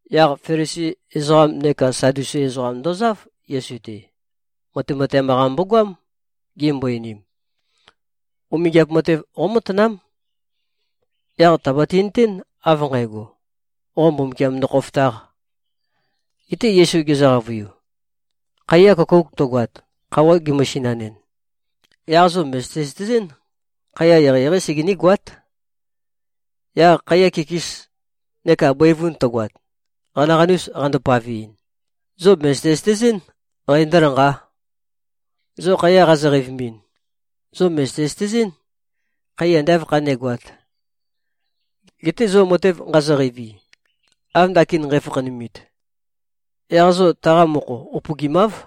Yaq Felisi ezoqam neka Sadusi ezoqam ndozáv, Yesu-te. Matemateam-qa mbogoám. Gimbo-einim, “Umingiap matev qómatanám. Yaq tàbati-nøtén av nqægo, qo Mbumbukiam ndokhofotāq.” Geté Yesu gezø-qavøiu, “Khaiya køkouk tøgoat, khøuwa gemøsinanɨn, yaq zo mø̀zøte-zøtezɨ́n, khaiya eqeieqeí segení-goát. Yaq khaiya kikis neka bøivun tøgoat, qanaqanus qando-paveɨn, zo mø̀zøte-zøtezɨ́n, qæ ndǿlanqá. Zo khaiya qazo-qeivimin, zo mø̀zøte-zøtezɨ́n, khaiya ande āv khanégoāt. Geté zo matev nqazo-qeivi, av ndakin nqæfakhanumit, yaq zo taqa mokho upøgimáv.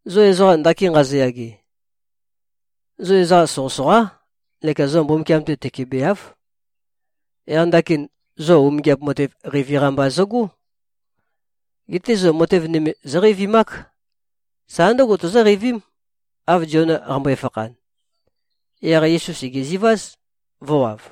Zo ezoqa ndakin nqazoyage, zo ezoqa soqøsoqá neka zo Mbumbukiam-te tøkebeáv. Yaq ndakin, zo umingiap matev qeivi-qa mba zøgó. Geté zo matev nøme zóqeivimák. Sa ndǿgo tozóqeivím, av Ziona qambøe-fakhan.” Yaq Yesu sègeziváz, vø̄wav.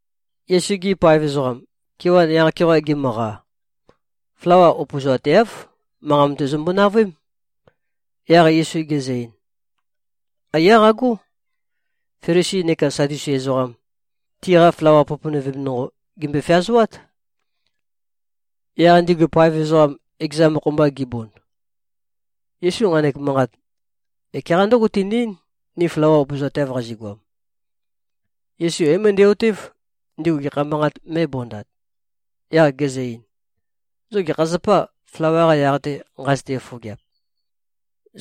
Yesu-gi paev ezoqam, kewan yaq-keoqa gimøqa, flawa upøzoateáv. Manqa mate zømbo-navøém. Yaq Yesu gezø-ein, “Aiyá qagó. Felisi neka Sadusi ezoqam, tiqa flawa poponøvem nonqo, gèmbøe-feazoát.” Yaq ndigu paev ezoqam, ekeza mokho-mba gibond, “Yesu nqanek manqat ekeqa ndǿgo tene-eín, ni flawa upøzoateav qazigoam.” Yesu é-møndæ-otév, ndigu gekha manqat mē꞉bondat. Yaq gezø-ein, “Zo gekha zapâ, flawa-qa yaq-te nqazøte-fofogeap?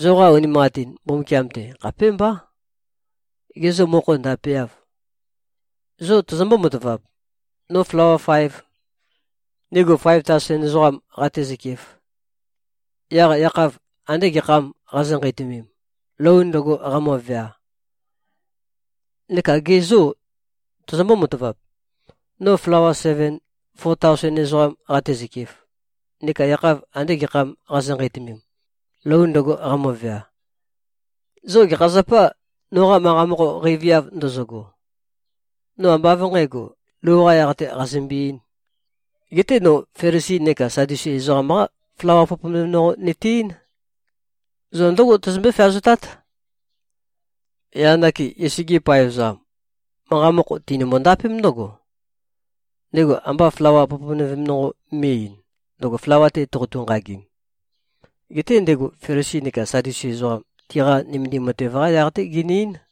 Zoqa unimanqatin Mbumbukiam-te khapémbá. Gê, zo mokho ndapeâv? Zo tozombó-matavap, no flawa faev, ndigu faev taosen ezoqam qatezøkef? Yaq yakhav andē gekhâm qazo-nqeitømem, lou ndøgo qamøvea? Neka gê, zo tozombó-matavap, no flawa seven, fo taosen ezoqam qatezøkef? Neka yakhav andē gekhâm qazo-nqeitømem, lou ndøgo qamøvea? Zo gekha zapâ, noqa manqa mokho qeiviav ndozogo? No ambá av nqǣgo, lou-qā yaq-tē qazømbe-eīn. Geté no Felisi neka Sadusi ezoqam-qa flawa poponøvem nonqo nøte-eín. Zo ndǿgo tozombøé-feazotát.” Yaq ndakin, Yesu-gi paev ezoqam, manqa mokho tinømbo-ndapém ndǿgo, ndego ambá flawa poponøvem nonqo me꞉-eīn, ndøgo flawa-te toqotu-nqagim. Geté ndego Felisi neka Sadusi ezoqam, tiqa nømendim matev-qa yaq-té gene-eín.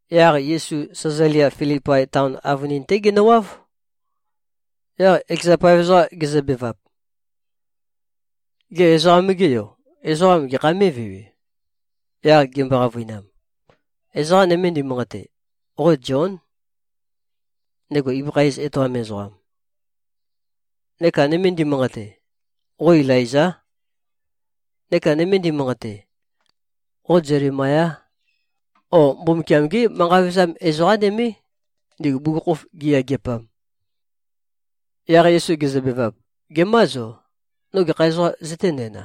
Yaq Yesu, Sæzalia-Filipai taon avønin-té genøwáv. Yaq ekeza paev ezoqam gezøbevap, “Gê, Ezoqam-ge Yo, ezoqam gekha mé꞉vewe?” Yaq gimbo-qavøinam, “Ezoqa nøme ndimanqate, qo Zión, ndego ibøkha iz etoam ezoqam. Neka nøme ndimanqate, qo Ilaizá. Neka nøme ndimanqate, qo Zelemayá, o Mbumbukiam-gé manqa vevezam ezoqá nømé, ndigu ibugukhokhof giyageapam.” Yaq Yesu gezøbevap, “Gemâ zo? No gekha ezoqām zøténæna?”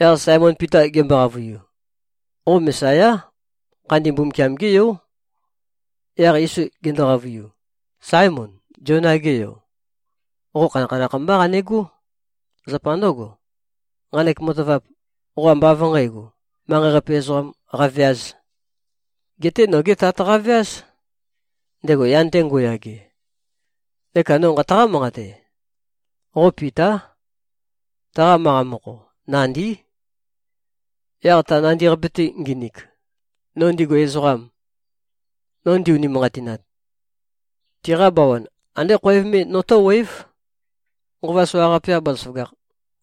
Yaq Saemon Pita gembo-qavøiu, “Qo Mesayá. Khandi Mbumbukiam-gé Yó.” Yaq Yesu gendo-qavøiu, “Saemon, Ziona-ge yo, qo khanakhanakh mbá qanegó. Zapa ndǿgo, nqanek matavap, qo ambá av nqǣgo, manqei-qape ezoqam qaveāz. Geté nogé Tat qaveáz, ndego yan-te ngo꞉yage. Neka no nqataqá-manqate. Qo Pitá. Taqa manqa mokho, ‘Nandí.’ Yaq ta nandi-qape-te nginik, no ndigu ezoqam, no ndi-unimanqatinat, tiqa bawan andé khoev me notó꞉wév. Nqova soqaqape-qa bazaføgakh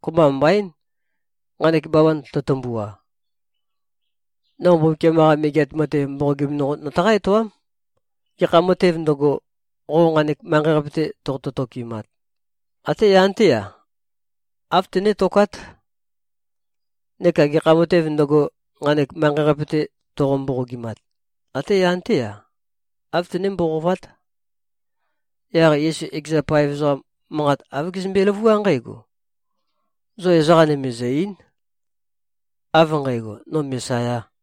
kopømba mbaín, nqanek bawan tøtømbua. No Mbumbukiam-qa Megeat Matev mboqogim nonqo nøtaqá-etoám. Gekha matēv ndøgo, qo nqanek manqei-qape-te toqotø-tokimat, até yan-té-a, āv tønétokát. Neka gekha matēv ndøgo, nqanek manqei-qape-te toqo-mboqogimat, até yan-té-a, āv tøné-mboqovát.” Yaq Yesu ekeza paev ezoqam manqa āv gezømbe-løvuá nqǽgo, “Zo ezoqa nøme zø̀-ei᷄n, av nqægo, no Mesayā.”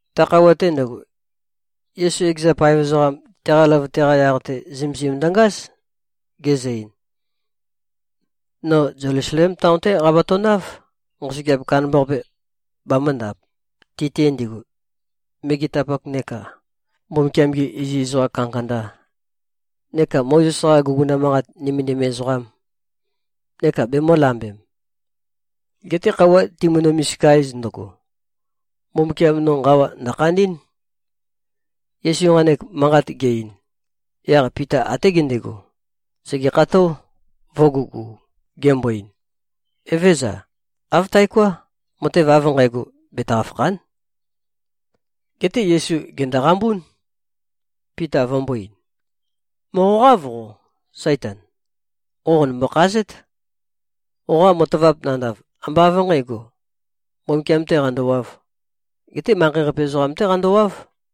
Ta khøuwa-te ndøgo, Yesu ekeza paev ezoqam, teqa løvøte-qa yaq-te zømesim ndøngáz. Gezø-ein, “No Zelusalem taon-té qabatønáv, nqosøgeap kandambaqape bamø̄ndap, ti-te ndigu, megetapak neka Mbumbukiam-gi iziz ezoqa kandakanda neka Mozes-qa guguna manqat nømendim ezoqam, neka bemø̄lambem. Geté khøuwa timønø-misika-ez ndøgo, Mbumbukiam no nqawa ndø̀khandí꞉n.” Yesu nqanek manqat ge-ein, yaq Pita até gendego, sègekható, vø̄gugu, gembo-ein, “Evézøza. Āv taoká! Matev av nqægo, betaqa-fàkha᷄n.” Geté Yesu, gèndoqambún, Pita vømbō-ein, “Mòqoqáv qo, Saitan! Qo qònømbø-khazét. Qoqa matavap nandav, ambá av nqǣgo, Mbumbukiam-tē qandowāv. Geté manqei-qape ezoqam-té qandowáv.”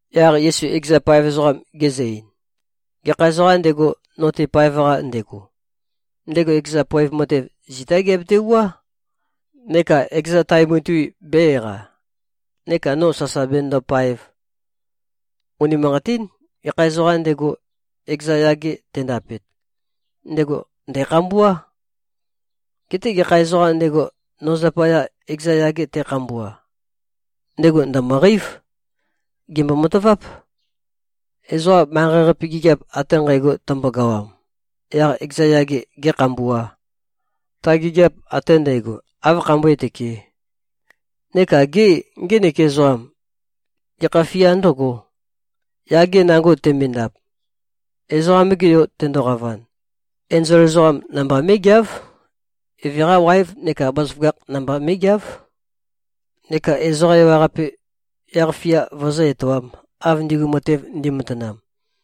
Yaq Yesu ekeza paev ezoqam gezø-ein, “Gekha ezoqām ndego, no-te paev-qa ndego, ndego ekeza poev matev zitá geabetewuá, neka ekeza tae mutui bē-eqa, neka no sasa benøndopaev. Unimanqatín. Gekha ezoqām ndego, ekeza yage tendapet, ndego ndæ̀khambuá. Geté gekha ezoqām ndego, no zapaya ekeza yage te꞉khambua, ndego ndø̀møqeív. Gèmbo-mataváp. Ezoqa manqei-qape gigiap ate nqægo tømbogawam, yaq ekeza yage gēkhambuā, ta gigiap ate ndægo áv khambøé-tøkē? Neka gê, ngenek ezoqam, gekha fia ndǿgō, yage nango temendap? Ezoqam-ge Yo tendoqavan, enzol ezoqám namba mé꞉geáv. Eve-qa waev neka bazaføgakh namba mé꞉geáv, neka ezoqa ewaqape yaq-fia vøzǿ-etoām, av ndigu matev ndi꞉matanam.